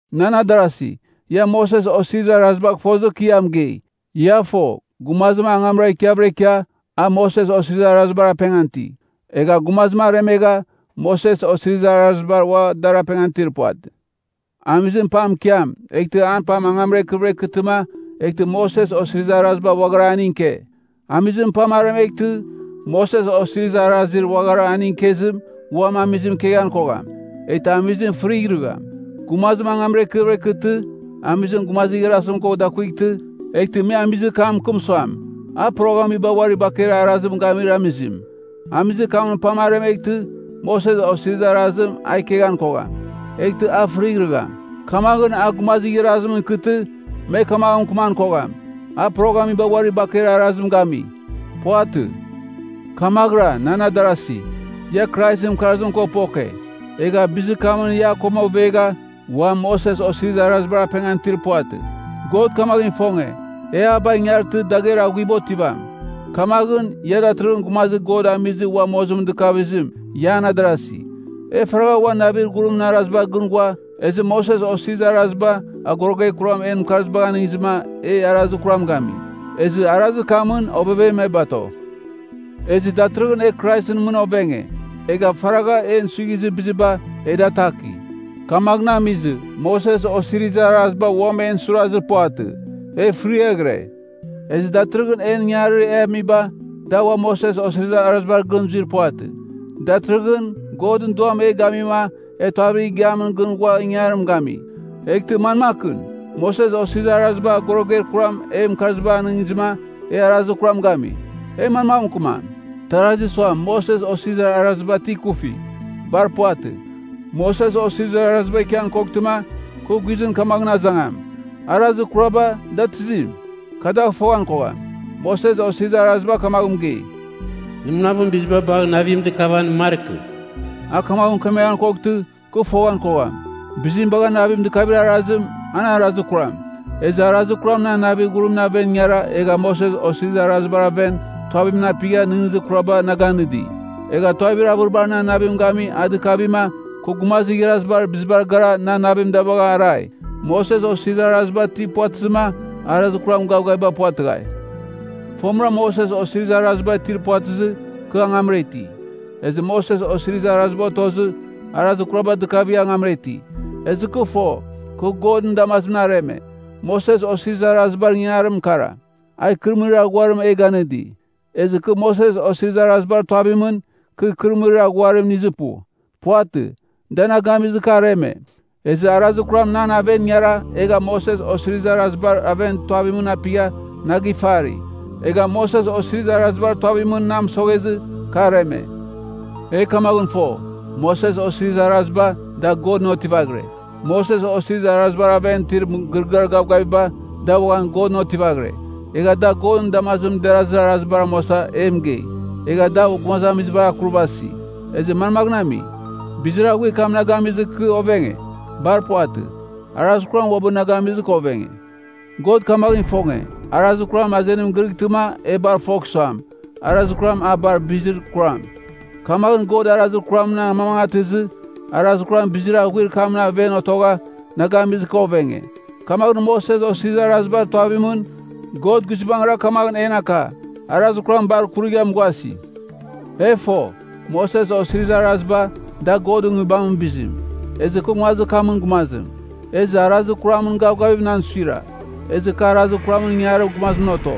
Nan adarasi, ia Moses Osirizir Arazibagh fozɨ kɨ ia mɨgei. Ia fo, gumazim angamra ikiavɨra ikia, a Moses Osirizir Arazibar apengan iti. Egha gumazim aremegha Moses Osirizir Arazibar uam a dar apengan itir puvatɨ. Amizim pam ikiam, eghtɨ an pam angamra ikɨvɨra ikɨtɨma, eghtɨ Moses Osirizir Araziba uaghara aning ike. Amizimɨn pam aremeghtɨ, Moses Osirizir Arazir uaghara aning ikezim uam amizim ikeghan kogham, eghtɨ amizim fɨrighrɨgham. Gumazim angamra ikɨvɨra ikɨtɨ, amizim gumazir igharazim ko dakuightɨ, eghtɨ me amizir kam mɨkɨm suam, a poroghamiba uari bakeir arazim gamir amizim. Amizir kamɨn pam aremeghtɨ, Moses Osirizir Arazim a ikeghan kogham, eghtɨ a fɨrighrɨgham. Kamaghɨn, a gumazir igharazimɨn ikɨtɨ, me kamaghɨn mɨkɨman kogham, a poroghamiba uari bakeir arazim gami. Puvatɨ. Kamaghɨra, nan adarasi, ia Kraisɨn mɨkarzim ko poke, egha bizir kamɨn ia a koma ovegha, uam Moses Osirizir Arazimɨn apengan itir puvatɨ. God kamaghɨn ifonge, e a bagh ingartɨ dagher aghuiba otivam. Kamaghɨn, ia datɨrɨghɨn gumazir God amizɨ ua mozimɨn dɨkavizim, ia an adarasi. E faragha uan navir ghurimɨn arazibar gɨn ghua, ezɨ Moses Osirizir Araziba agoroguer kuram en mɨkarzibagh anɨngizɨma, e arazir kuram gami. Ezɨ arazir kamɨn ovevem e bato. Ezɨ datɨrɨghɨn e Kraisɨn mɨn ovenge, egha faragha en suighizir biziba, e da ataki. Kamaghɨn amizɨ, Moses Osirizir Araziba uam en suirazir puvatɨ, e fɨriaghɨre. Ezɨ datɨrɨghɨn en ingangarir e amiba, da ua Moses Osirizir Arazibar gɨn zuir puvatɨ. Datɨrɨghɨn, Godɨn Duam e gamima e tuavir igiamɨn gɨn ghua ingangarim gami. Eghtɨ manmakɨn? Moses Osirizir Araziba agoroguer kuram en mɨkarzibagh anɨngizɨma, e arazir kuram gami, e manmagh mɨkɨmam? Tarazi suam, Moses Osirizir Araziba ti ikufi. Bar puvatɨ. Moses Osirizir Araziba ikian koghtɨma, kɨ guizɨn kamaghɨn azangam, arazir kuraba, da tizim? Kɨ dagh foghan kogham. Moses Osirizir Araziba kamagh mɨgei, “Nɨ munavɨn biziba bagh navim dɨkavan markɨ.” A kamaghɨn mɨkemeghan koghtɨ, kɨ foghan kogham, biziba bagha navim dɨkavir arazim, an arazir kuram. Ezɨ arazir kuram nan navir ghurimɨn aven ingara egha Moses Osirizir Arazibar aven tuavimɨn apigha nɨghnɨzir kuraba na ganɨdi. Egha tuavir avɨribar nan navim gami a dɨkavima, kɨ gumazir igharazibar bizibar gara nan navim da bagha arai. Moses Osirizir Araziba ti puvatɨzɨma, arazir kuram gavgaviba puvatɨghai. Fomɨra Moses Osirizir Araziba itir puvatɨzɨ, kɨ angamra iti. Ezɨ Moses Osirizir Araziba otozɨ, arazir kuraba dɨkavigha angamra iti, ezɨ kɨ fo, kɨ Godɨn damazimɨn areme. Moses Osirizir Arazibar ingangarimra kara, a ikɨrɨmɨrir aghuarim e ganɨdi. Ezɨ kɨ Moses Osirizir Arazibar tuavimɨn, kɨ ikɨrɨmɨrir aghuarim inizir pu. Puvatɨ, da na gamizɨ, kɨ areme. Ezɨ arazir kuram nan aven ingara egha Moses Osirizir Arazibar aven tuavimɨn apigha na gifari. Egha Moses Osirizir Arazibar tuavmɨn na mɨsoghezɨ, kɨ areme. E kamaghɨn fo, Moses Osirizir Araziba, da Godɨn otivaghire. Moses Osirizir Arazibar aven itir mɨgɨrɨgɨar gavgaviba, da uaghan Godɨn otivaghire, egha da Godɨn damazimɨn derazir arazibar amuasa e mɨgei, egha da gumazamizibar akurvasi. Ezɨ manmagh ami? Bizir aghuir kam ti na gamizɨ kɨ ovenge? Bar puvatɨ. Arazir kuram uabɨ na gamizɨ kɨ ovenge. God kamaghɨn ifonge, arazir kuram azenim girɨghtɨma e bar fogh suam, arazir kuram a bar bizir kuram. Kamaghɨn God arazir kuramɨn amamangatɨzɨ, arazir kuram bizir aghuir kamɨn aven otogha na gamizɨ kɨ ovenge. Kamaghɨn Moses Osirizir Arazibar tuavimɨn, God guizbangɨra kamaghɨn en aka, arazir kuram bar kurigha mughasi. E fo, Moses Osirizir Araziba, da Godɨn Nguibamɨn bizim, ezɨ kɨ nguazir kamɨn gumazim. Ezɨ arazir kuramɨn gavgavim nan suira, ezɨ kɨ arazir kuramɨn ingangarir gumazimɨn oto.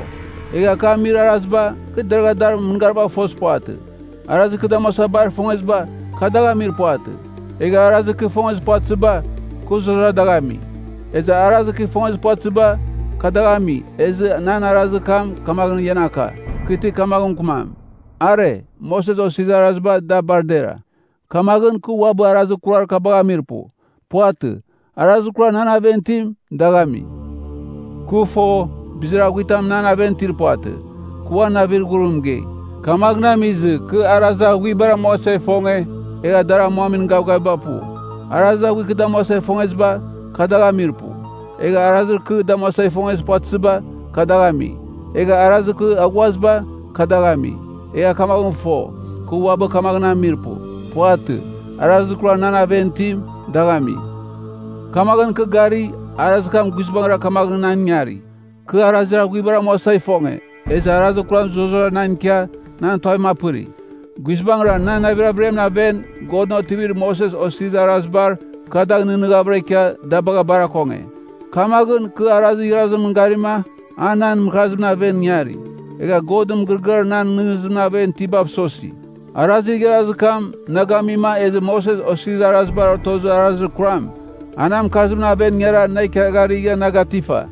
Egha kɨ amir araziba, kɨ deragha dar mɨngaribagh fozir puvatɨ. Arazir kɨ damuasa bar ifongeziba, kɨ dagh amir puvatɨ. Egha arazir kɨ ifongezir puvatɨziba, kɨ zurara dagh ami. Ezɨ arazir kɨ ifongezir puvatɨziba, kɨ dagh ami, ezɨ nan arazir kam kamaghɨn ian aka, kɨ ti kamaghɨn mɨkɨmam, Are, Moses Osirizir Araziba da bar dera. Kamaghɨn, kɨ uabɨ arazir kurar kabagh amir pu. Puvatɨ. Arazir kurar nan aven itim, dagh ami. Kɨ fo, bizir aghuitam nan aven itir puvatɨ. Kɨ uan navir ghurim mɨgei. Kamaghɨn amizɨ, kɨ arazir aghuibar amuasa ifonge, egha dar amuamin gavgaviba pu. Arazir aghuir kɨ damuasa ifongeziba, kɨ dagh amir pu. Egha arazir kurar kɨ damuasa ifongezir puvatɨziba, kɨ dagh ami. Egha arazir kɨ aghuaziba, kɨ dagh ami, egha kamaghɨn fo, kɨ uabɨ kamaghɨn amir pu. Puvatɨ. Arazir kurar nan aven itim, dagh ami. Kamaghɨn kɨ gari, arazir kam guizbangɨra kamaghɨn nan ingari: kɨ arazir aghuibar amuasa ifonge, ezɨ arazir kuram zurara na ko ikia nan tuavim apɨri. Guizbangɨra, nan navir averiamɨn aven, Godɨn otivir Moses Osirizir Arazibar, kɨ dagh nɨghnɨghavɨra ikia da bagha bar akonge. Kamaghɨn, kɨ arazir igharazimɨn garima, a nan mɨkarzimɨn aven ingari. Egha Godɨn mɨgɨrɨgɨar nan nɨghnɨzimɨn aven itibav sosi. Arazir igharazir kam, na gamima, ezɨ Moses Osirizir Arazibar otozir arazir kuram, a nan mɨkarzimɨn aven ingara na ikiagharigha na gatifa.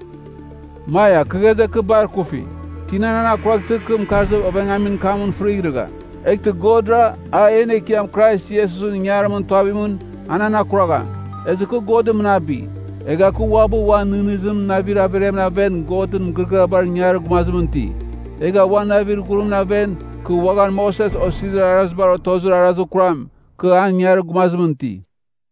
Maia! Kɨ ghaze, kɨ bar ikufi! Tina nan akuraghtɨma, kɨ mɨkarzir ovengamin kamɨn fɨrighrɨgham? Eghtɨ Godra, a en Ekiam Krais Iesusɨn ingangarimɨn tuavimɨn, a nan akuragham! Ezɨ kɨ God mɨnabi! Egha kɨ uabɨ, uan nɨghnɨzimɨn navir averiamɨn aven Godɨn mɨgɨrɨgɨabar ingarir gumazimɨn iti. Egha uan navir ghurimɨn aven, kɨ uaghan Moses Osirizir Arazibar otozir arazir kuram, kɨ an ingangarir gumazimɨn iti.